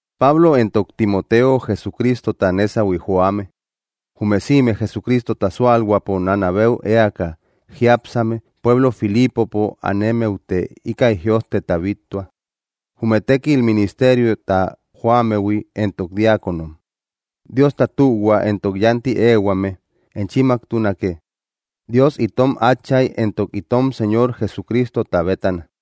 Pablo entok Timoteo Jesucristota nésahui joame, jume sïme Jesucristota súalhuäpo nánabeu eaka jiápsame pueblo Filipopo anemmeute íkäi jïojteta bíttua, jume tékil ministeriota joammehui entok diáconom. Diosta tühua entok yánti éehuame enchimmaktunake, Dios itom Átchay éntok itom Señor Jesucristota bétana.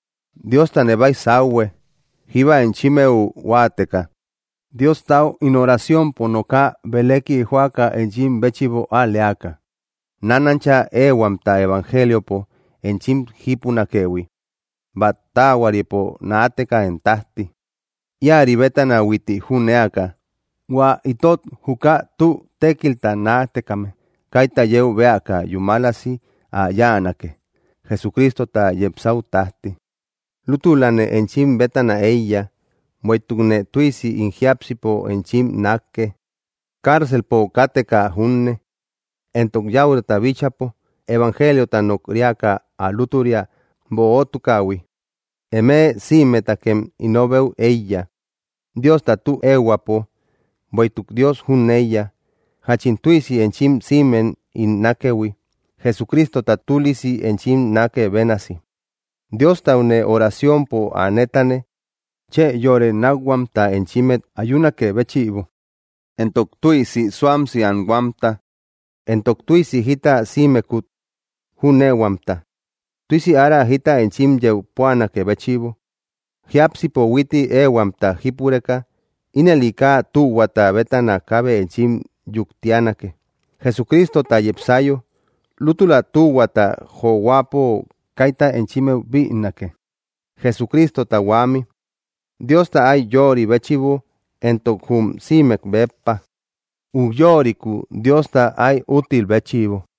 Diostane baysauhue, jíba enchimmeu huáateka, Diostau ín oraciompo nooka belëki joaka enchim béchïbo al‑leaka, nánancha éehuamta evangeliopo enchim jípunakëhui, bát taahuaripo naateka én tájti. Íäri bétana huitti jünéaka, hua itot juka tü tékilta naatekame kaita yeu bëaka yúmalasi ä yáanake, Jesucristota yepsäu tájti. Lútülane enchim bétana éiya, bueïtukne tüisi ín jiápsipo enchim nákke, cárcelpo káteka junne, entok yäurata bíchäpo evangeliota nok‑riaka ä lútüria böotukähui. Eme sïmetakem ínobeu éiya, Diosta tü ehuäpo. Bueïtuk Dios jüneiya, jáchin tüisi enchim sïmem ín nákëhui, Jesucristota tülisi enchim nákë bénasi. Diostaune oraciompo ä nétane, chë yore nákhuamta enchimmet ayunakë béchïbo, entok tüisi suamsi anhuamta, entok tüisi jita sïmekut jüneehuamta, tüisi ára jita enchim yeu púanakë béchïbo, jiápsipo huitti éehuamta jípureka. Ínëli kaa tühuata bétana kaabe enchim yuktianake, Jesucristota yepsayo. Lútüla tühuata johuäpo kaita enchimmeu bïnake, Jesucristota huämi, Diosta áy yöri béchïbo entok jum sïmek béppa ujyorikuu Diosta áy úttil béchïbo.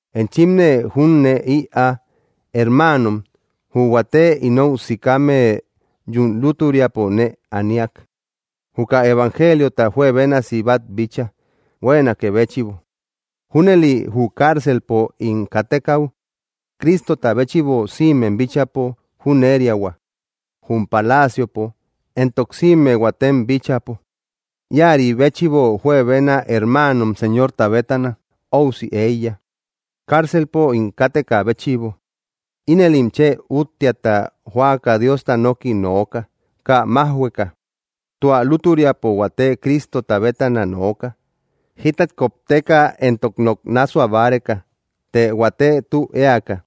Enchimne jünee ïaa, hermaanom: jü huate inou sikame yún lútüriapo nee aniak, juka evangeliota juebénasi bát bíchaa huéenakë béchïbo. Júnëli jü cárcelpo ín kátekäu, Cristota béchïbo sïmem bíchäpo jüneriahua, jum palaciopo, entok sïme huatem bíchäpo. Íäri béchïbo juebena hermaanom Señorta bétana óusi éiya, cárcelpo ín káteka béchïbo. Inëlim chë úttiata joaka Diosta noki nooka, kaa májhueka. Tua lútüriapo huate Cristota bétana nooka, jítat kopteka entok nok nássua báreka, të huate tü éaka.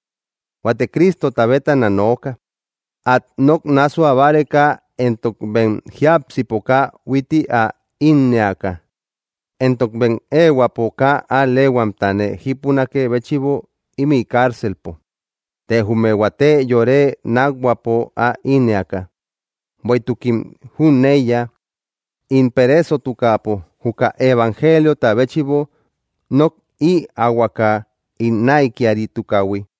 Huate Cristota bétana nooka, át nok nássua báreka entok bem jiápsipo kaa huitti ä ínnëaka, entok bem éehuäpo kaa al‑leehuamta nee jípunakë béchïbo ímï cárcelpo, të jume huate yore nákhuäpo ä ínnëaka, bueïtukim jüneiya, ín pereesotukäpo juka evangeliota béchïbo nok ïaahuaka ín näikiaritukähui.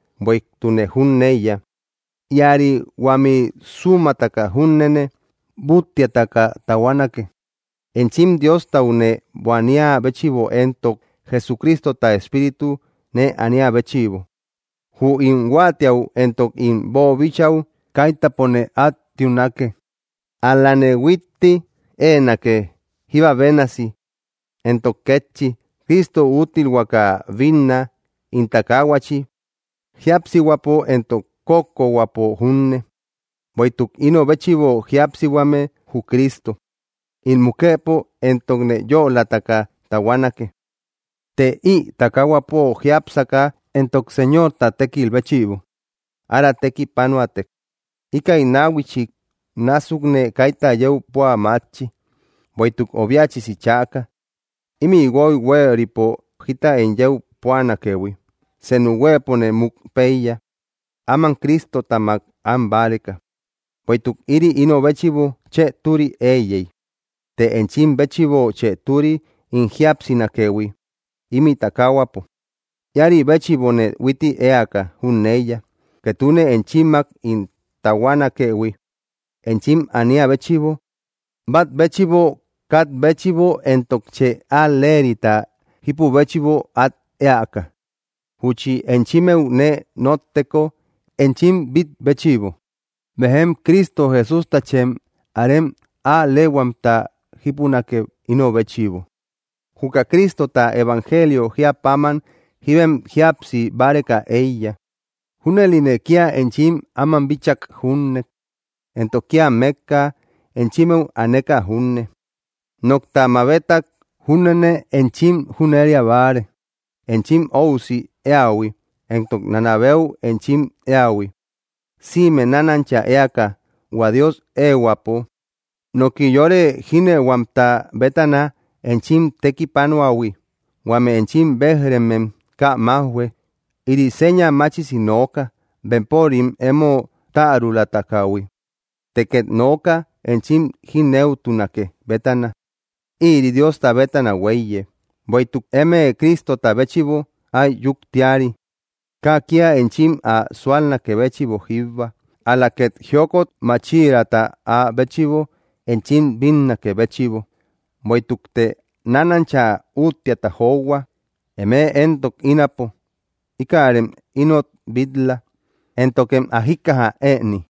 Bueïtukne jüneiya, íäri huämi súmataka júnene búttiataka tahuanake, enchim Diostau nee buaniä béchïbo entok Jesucristota espíritu nee aniä béchïbo. Jü ín huáatiäu entok ín boobichäu kaitapone át tiunake, ál‑lane huitti éenake, jíba bénasi. Entok kétchi, Cristo úttilhuaka binná ín takaahuachi, jíapsihuäpo entok kókkohuäpo junne. Bueïtuk ino béchïbo jíapsihuame jü Cristo; ín mukëpo éntokne yölataka tahuanake. Të ï takaahuapo jiápsaka entok Señorta tékil béchïbo ára tekipanoätek, íkäi náhuichik násukne kaita yeu púa mátchi. Bueïtuk obiachisi chäka, ímï guoy huéeripo jita ín yeu púanakëhui: Senu huëpone muk péiya, áman Cristotamak an báreka, bueïtuk ïri ino béchïbo chë türi éiyey. Të enchim béchïbo chë türi ín jíapsinakëhui ímï takaahuapo. Íäri béchïbone huitti éaka jüneiya, ketune enchimmak ín tahuanakëhui, enchim ania béchïbo. Bat béchïbo kat béchïbo entok chë al‑lerita jípü béchïbo at eäka. Júchi enchimmeu nee notteko enchim bit‑béchïbo, bejem Cristo Jesústachem arem al‑lehuamta jípunake, ino béchïbo. Juka Cristota evangelio jíä páman jíbem jíapsi báreka éiya. Júnëline kía enchim áman bíchak junne, entok kía mékka enchimmeu aneka junne, nokta mabetak júnene enchim jüneria báare, enchim óusi éähui, entok nanabeu enchim éähui, sïme nánancha éaka hua Dios éehuäpo, noki yore jínëuhuamta bétana enchim tekipanuähui. Huame enchim béj‑remem kaa májhue. Ïri seña machisi nooka bempörim emo tärulatukähui; të ket nooka enchim jínëutunake bétana. Ïri Diosta bétana huéiye. Bueïtuk eme Cristota béchïbo áy yuktiari, kaa kía enchim ä súalnakë béchïbo jíbba, ál‑la két jiokot máchiraata áa béchïbo enchim bínnakë béchïbo. Bueïtukte nánancha úttiata johua, emëe entok ínapo. Íkärem inot bil-la, éntokem ä jíkkaja ëni.